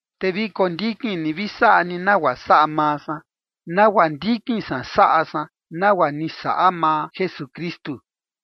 Te vi kondikin ni vi saꞌa ni nagua saꞌa maa san, nagua ndikin san saꞌa san nagua ni saꞌa maa Jesukristu.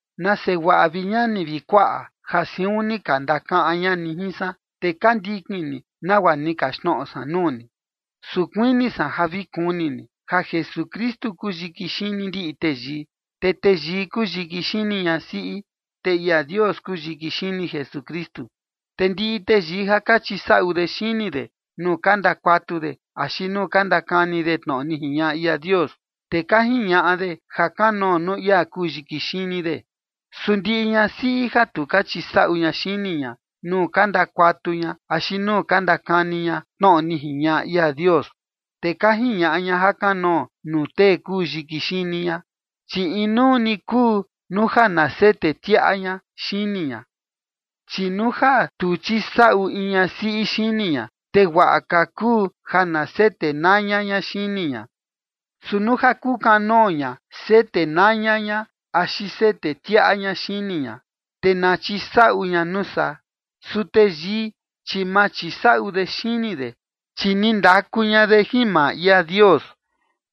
Nase guaꞌa, vi ñani vi kuaꞌa, ja siun ni ka ndakaꞌan ña ni jin san, te ka ndikin ni nagua ni kaxtnoꞌo san nuu ni. Su kuini san ja vi kuni ni ja Jesukristu kuu yiki xini ndiꞌi teyii, te teyii kuu yiki xini ñasiꞌi, te ia Dios kuu yiki xini Jesukristu. Te ndiꞌi teyii ja ka chisaꞌu de xini de nuu ka ndakuatu de axi nuu ka ndakani de tnoꞌo ni jiñaꞌa ia Dios, te ka jiñaꞌa de jakanoo nuu ia kuu yiki xini de. Su ndiꞌi ñasiꞌi ja tu ka chisaꞌu ña xini ña nuu ka ndakuatu ña axi nuu ka ndakani ña tnoꞌo ni jiñaꞌa ia Dios, te ka jiñaꞌa ña jakanoo nuu tee kuu yiki xini ña, chi inuu ni kuu nuu ja na sete tiaꞌa ña xini ña. Chi nuu ja tu chisaꞌu in ñasiꞌi xini ña, te guaꞌa ka kuu ja na sete naña ña xini ña. Su nuu ja kukanoo ña sete naña ña axi sete tiaꞌa ña xini ña, te na chisaꞌu ña nuu saa. Su teyii, chi ma chisaꞌu de xini de, chi ni ndaku ña de jin maa ia Dios,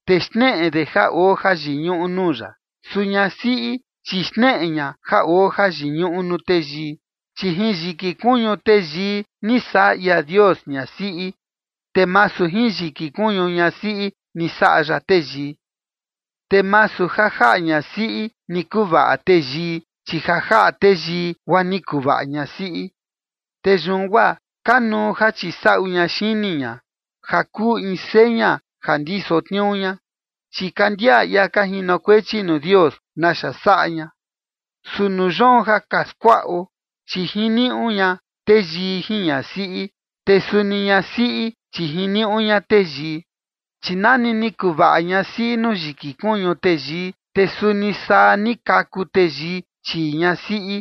te xneꞌe de ja oo jayiñuꞌu nuu ya. Su ñasiꞌi, chi xneꞌe ña ja oo jayiñuꞌu nuu teyii. Chi jin yiki kuñu teyii ni saꞌa ia Dios ñasiꞌi, te masu jin yiki kuñu ñasiꞌi ni saꞌa ya teyii. Te masu ja jaꞌa ñasiꞌi ni kuvaꞌa teyii, chi ja jaꞌa teyii guaa ni kuvaꞌa ñasiꞌi. Te yun guaa kanuu ja chisaꞌu ña xini ña, ja kuu in seña ja ndiso tniuu ña, chi ka ndiaꞌa ia ka jinokuechi nuu Dios naxa saꞌa ña. Su nuu yoon ja ka skuaꞌo, chi jiniuꞌu ña teyii jin ñasiꞌi, te suni ñasiꞌi chi jiniuꞌu ña teyii. Chi nani ni kuvaꞌa ñasiꞌi nuu yiki kuñu teyii, te suni saa ni kaku teyii chii ñasiꞌi,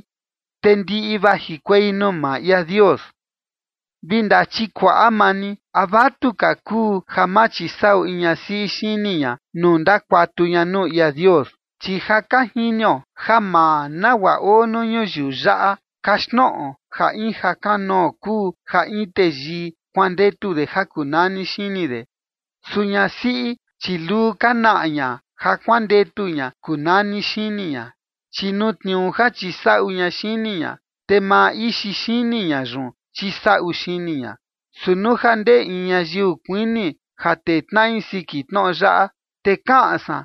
te ndiꞌi vajikuei nuu maa ia Dios. Vi ndachikuaꞌa maa ni, ¿a vatuka kuu ja ma chisaꞌu in ñasiꞌi xini ña nuu ndakuatu ña nuu ia Dios? Chi ja ka jinio ja maa nagua oo nuu ñuyiu yaꞌa kaxtnoꞌo ja in jakanoo kuu ja in teyii kuandetu de ja kuu nani xini de. Su ñasiꞌi, chi luu ka naꞌa ña ja kuandetu ña kuu nani xini ña, chi nuu tniuu ja chisaꞌu ña xini ña, te maa ixi xini ña yun chisaꞌu xini ña. Su nuu ja ndee in ñayiu kuini ja tee tnaꞌi siki tnoꞌo yaꞌa, te kaꞌan san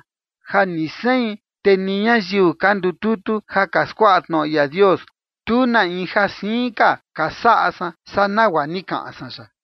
ja ni sein, te ni ñayiu ka ndututu ja ka skuaꞌa tnoꞌo ia Dios, tu na in ja siin ka ka saꞌa san saa nagua ni kaꞌan san yaꞌa.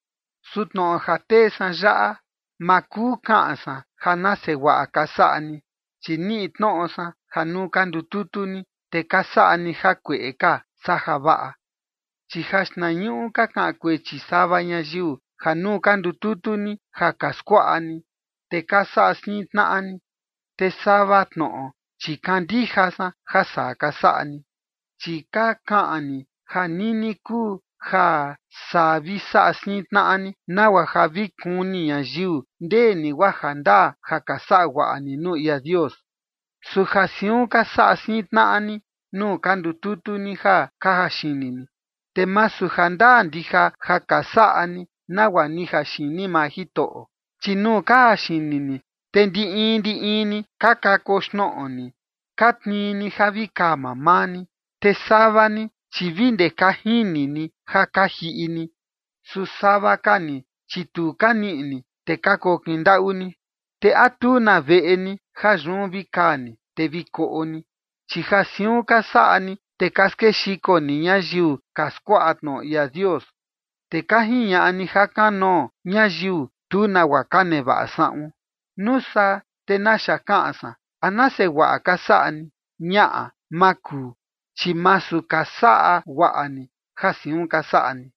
Su tnoꞌo ja tee san yaꞌa, ma kuu kaꞌan san ja nase guaꞌa ka saꞌa ni, chi niꞌi tnoꞌo san ja nuu ka ndututu ni, te ka saꞌa ni jakueꞌe ka saa javaꞌa. Chi jaxtnañuꞌu, ka kaꞌan kuechi sava ñayiu ja nuu ka ndututu ni ja ka skuaꞌa ni, te ka saꞌa siin tnaꞌa ni. Te sava tnoꞌo, chi kandija san ja saa ka saꞌa ni. Chi ka kaꞌan ni ja nini kuu ja saa vi saꞌa siin tnaꞌa ni, nagua ja vi kuni ñayiu ndee ni guaa jandaa ja ka saꞌa guaꞌa ni nuu ia Dios. Su ja siun ka saꞌa siin tnaꞌa ni nuu ka ndututu ni ja ka jaxini ni, te masu jandaa ndija ja ka saꞌa ni nagua ni jaxini maa Jitoꞌo. Chi nuu ka jaxini ni, te ndi in ndi in ni ka kakoxnoꞌo ni, ka tnii ni ja vi kaa mamaa ni. Te sava ni, chi vi ndee ka jini ni ja ka jiꞌi ni. Su sava ka ni, chi tu ka niꞌi ni, te ka kokin ndaꞌu ni. ¿Te a tu na veꞌe ni ja yun vi kaa ni, te vi koꞌo ni? Chi ja siun ka saꞌa ni, te ka skexiko ni ñayiu ka skuaꞌa tnoꞌo ia Dios, te ka jiñaꞌa ni jakanoo ñayiu tu nagua ka nevaꞌa saꞌun. ¿Nuu saa te naxa kaꞌan san? ¿A nase guaꞌa ka saꞌa ni? Ñaꞌa, ma kuu, chi masu ka saꞌa guaꞌa ni ja siun ka saꞌa ni.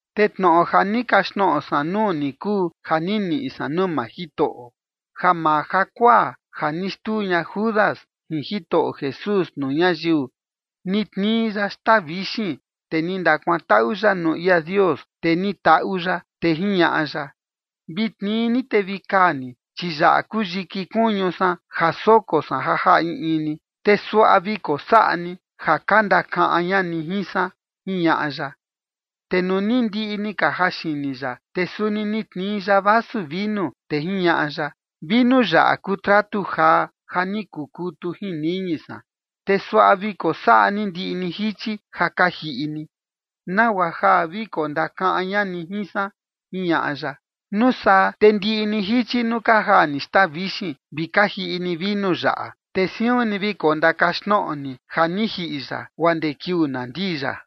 Te tnoꞌo ja ni kaxtnoꞌo san nuu ni kuu ja ni niꞌi san nuu maa Jitoꞌo: Ja maa jakuaa ja ni xtuu ña Judas jin Jitoꞌo Jesús nuu ñayiu, ni tnii ya xtaa vixin, te ni ndakuantaꞌu ya nuu ia Dios, te ni taꞌu ya, te jiñaꞌa ya: “Vi tnii ni te vi kaa ni, chi yaꞌa kuu yiki kuñu san ja soko san ja jaꞌa in in ni, te suaꞌa vi kosaꞌa ni ja ka ndakaꞌan ña ni jin san”, jiñaꞌa ya. Te nuu ni ndiꞌi ni ka jaxini ya, te suni ni tnii ya vasu vinu, te jiñaꞌa ya: “Vinu yaꞌa kuu tratu jaa ja ni kukutu jin niñi san, te suaꞌa vi kosaꞌa ni ndiꞌi ni jichi ja ka jiꞌi ni, nagua ja vi kondakaꞌan ña ni jin san”, jiñaꞌa ya. Nuu saa te ndiꞌi ni jichi nuu ka jaa ni xtaa vixin, vi ka jiꞌi ni vinu yaꞌa, te siun ni vi kondakaxtnoꞌo ni ja ni jiꞌi ya guaa ndee kiuu na ndii ya.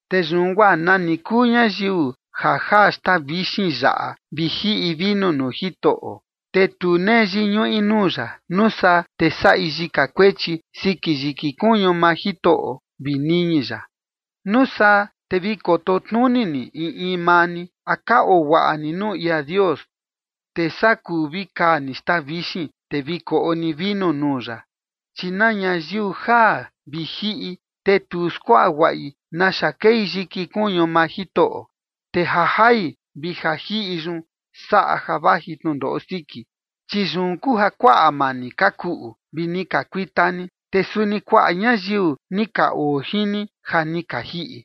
Te yun guaa nani kuu ñayiu ja jaa xtaa vixin yaꞌa vi jiꞌi vinu nuu Jitoꞌo, te tu nee yiñuꞌi nuu ya, nuu saa te saꞌi yika kuechi siki yiki kuñu maa Jitoꞌo vi niñi ya. Nuu saa te vi koto tnuni ni in in maa ni: A ka oo guaꞌa ni nuu ia Dios, te saa kuu vi kaa ni xtaa vixin, te vi koꞌo ni vinu nuu ya. Chi na ñayiu jaa vi jiꞌi, te tu skuaꞌa guaꞌi naxa kei yiki kuñu maa Jitoꞌo, te ja jai vi ja jiꞌi yun saꞌa ja vaji tnundoꞌo siki. Chi yun kuu ja kuaꞌa maa ni ka kuꞌu vi ni ka kuita ni, te suni kuaꞌa ñayiu ni ka oo jin ni ja ni ka jiꞌi.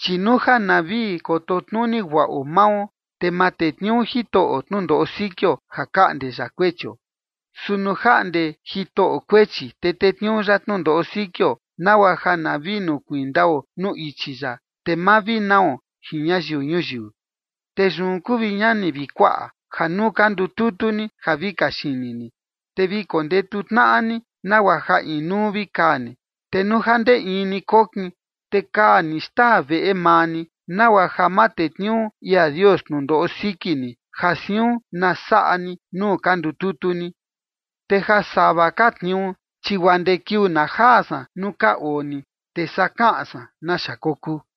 Chi nuu ja na vi koto tnuni guaꞌo mao, te ma tetniuu Jitoꞌo tnundoꞌo sikio ja kaꞌnde ya kuechio. Su nuu jaꞌnde Jitoꞌo kuechi, te tetniuu ya tnundoꞌo sikio nagua ja na vi nukuiin ndao nuu ichi ya, te ma vi nao jin ñayiu ñuyiu. Te yun kuu, vi ñani vi kuaꞌa, ja nuu ka ndututu ni ja vi kaxini ni, te vi kondetu tnaꞌa ni, nagua ja inuu vi kaa ni. Te nuu ja ndee in ni kokin, te kaa ni xtaa veꞌe maa ni, nagua ja ma tetniuu ia Dios tnundoꞌo siki ni ja siun na saꞌa ni nuu ka ndututu ni. Te ja sava ka tniuu, chi guaa ndee kiuu na jaa san nuu ka oo ni, te saa kaꞌan san naxa kokuu.